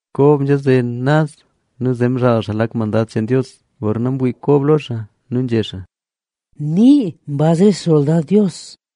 Kob nzhaze naz nu zee mzhaal xaa lak mandad cheen Dios. Gorna mwii Kob lo xaa, nu nzhé xaa: —¡Nee mbaz re xsoldad Dios!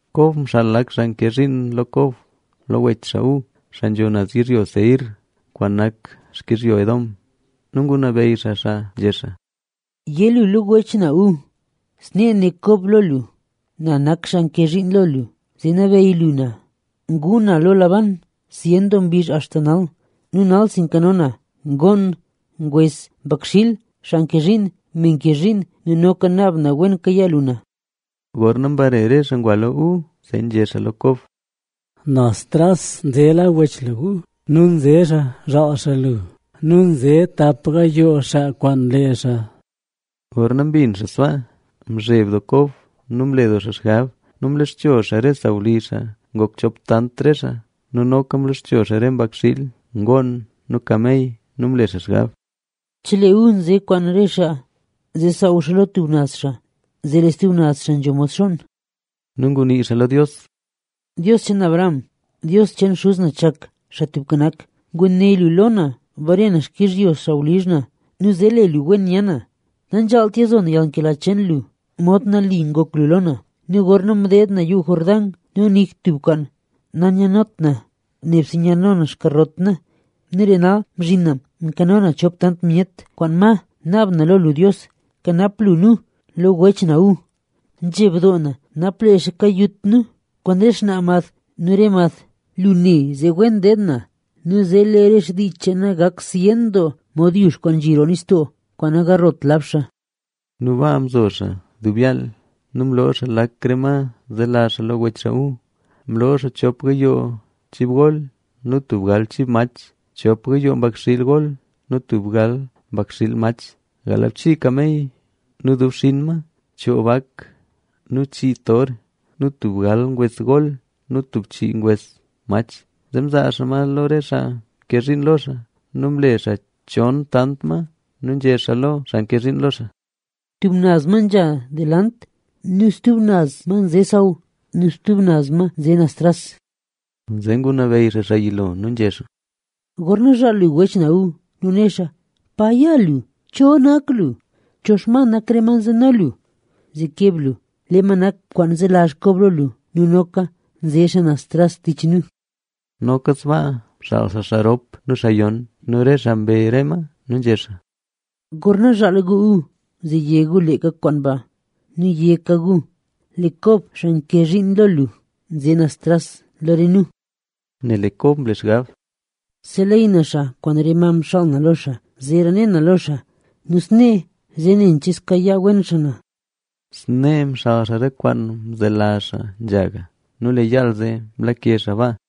Kob mxaal lak xaa nke zhiin lo Kob lo wech xaa Esaú, xaa nzho naz yizhyo Seir kwaan nak xkizhyo Edom. Nu ngunabeyy xaa xaa nzhé xaa: —Yé lu lo wech na Esaú: “Snee né Kob lo lu: Na nak xaa nke zhiin lo lu, zee nabeyy lu na. Ngu na lo Labán zyen doo mbizh axta nal. Nu nalsi nkano na: ngoon, ngwes, mbakxiil, xaa nke zhiin nu me nke zhiin lo na, nu noka naab na wen kayaa lu na.” Gorna mbare re xaa ngwa lo Esaú, zee nzhé xaa lo Kob: —Naz tras nzela wech lu Esaú nu nze xaa zhaal xaa lu nu nze xaa kwaan tap gayoo xaa kwaan lee xaa. Gorna mbin xaa sbaa, mzheb doo Kob nu mle doo xaa xgab. Nu mloxcho xaa re sawlizh xaa ngok chop tant re xaa nu noka mloxcho xaa re mbakxiil, ngoon nu kamey. Nu mle xaa xgab: “Chelee Esaú nze kwaan re xaa zee saaw lo tub naz xaa, zee lee stub naz xaa nzho mod xonn”. Nu ngunii xaa lo Dios: —Dios cheen Abraham, Dios cheen xuz na Chak Xaa Tubka Nak, nguné lu lo na bare na xkizhyo sawlizh na nu zee le lu wen nya na. Nanzhaalt yalzo na yalnkela cheen lu mod nali ngok lu lo na. Nu gorna mdeed na Yuu Jordán nu nik tub kwaan nanyanot na, nebse nyano na xkarot na; nu lee nal mzhin na mkano na chop tant myet kwaan ma. ¡Naab na lo lu Dios, kanap lu nu lo wech na Esaú! Nzheb doo na napa lee xaa kayut nu kwaan re xnaa mad nu re mad. Lu né: “Wen deed na nu zee lee re dii cheen na gak zyen doo mod yux kwaan nzhi roo nistoo, kwaan nagarlot lab xaa”. Nu baa mzo xaa dub yaal. Nu mloo xaa lak re ma zelazh xaa lo wech xaa Esaú. Mloo xaa: chop gayoo chib gol nu tub gal chib mach, chop gayoo mbakxiil gol nu tub gal mbakxiil mach, galbchii kamey nu dub xinn ma, choo bak nu chii ngon nu tub gal ngwes gol nu tub chii ngwes mach. Zee mzaa xaa ma lo re xaa nke zhiin lo xaa nu mle xaa chon tant ma. Nu nzhé xaa lo xaa nke zhiin lo xaa: —Tub naz ma nzha delant nu stub naz ma nze xsaw, nu stub naz ma nze naz tras. Zee ngunabeyy xaa xaa yilo nu nzhé xaa: —Gorna zhaal lu wech na Esaú nu né xaa: “¿Pa ya lu? ¿Cho nak lu? ¿Cho xma nak re ma nzeno lu?” Zee keb lu: “Lee ma nak kwaan nzelazh Kob lo lu. Nu noka nze xaa naz tras tich nu.” Noka sbaa mxaal xaa, xaa rop nu xaa yon nu re xaa mbe re ma. Nu nzhé xaa: —Gorna zhaal gu Esaú, zee yé gu leeka kwaan ba. Nu yéka gu: “Lee Kob, xaa nke zhiin lo lu, nze naz tras lo re nu”. Nel lee Kob mle xgab: “Seleyy na xaa kwaan re ma mxaal na lo xaa, zeera ne na lo xaa. Nu snee, zee nen che zkayaa wen xaa na.” Snee mxaal xaa re kwaan mzelazh xaa nzhaga nu lee yaal zee mlake xaa baa.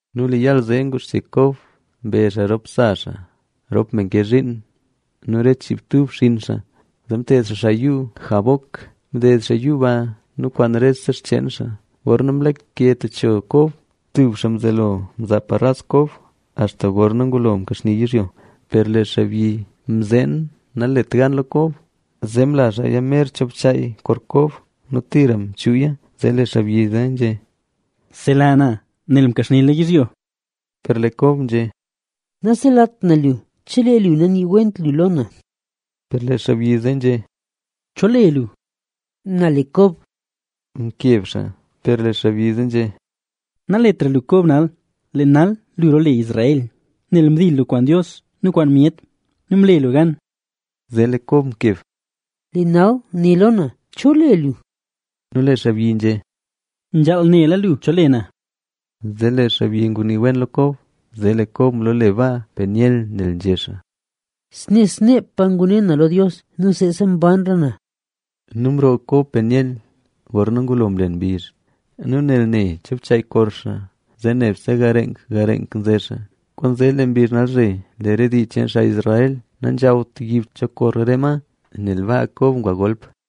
Nu lee yaal zee nguxche Kob mbe xaa rop sa xaa, rop me nke zhiin nu re chiibtub xinn xaa, zee mted xaa xaa Yuu Jaboc. Mded xaa yuu ba nu kwaan rese xcheen xaa. Gorna mlake techo Kob, tub xaa mzelo mzaa paras Kob axta gorna ngulo mkaxnila yizhyo. Per lee xaabyi mzeen nalet gan lo Kob, zee mla xaaya mer cho bchaay kor Kob nu tira mchuuya. Zee lee xaabyi zee nzhé: —¡Sela na! Nel mkaxnila yizhyo. Per lee Kob nzhé: —Naselat na lu chelee lu naniiwent lu lo na. Per lee xaabyi zee nzhé: —¿Cho le lu? —Na le Kob —mkeb xaa. Per lee xaabyi zee nzhé: —Naletra lu Kob nal, lee nal lu roole Israel,b nel mdil lu kwaan Dios nu kwaan myet nu mle lu gan. Zee lee Kob mkeb: —Lee nal né lo na, ¿cho le lu? Nu lee xaabyi nzhé: —Nzhaal nela lu cho le na. Zee lee xaabyi ngunii wen lo Kob. Zee lee Kob mloole baa Penielc nel nzhé xaa: “Snee sneepa ngune na lo Dios nu seesa mbanra na”. Nu mroo Kob Peniel gorna ngulo mlen mbizh; nu nel ne cho bchaay kor xaa, zee nebse gareenk nze xaa. Kwaanzee lee mbizh nalzhe lee re dii cheen Israel nanzhawt yib cho kor re ma, nel baa Kob ngwa golp.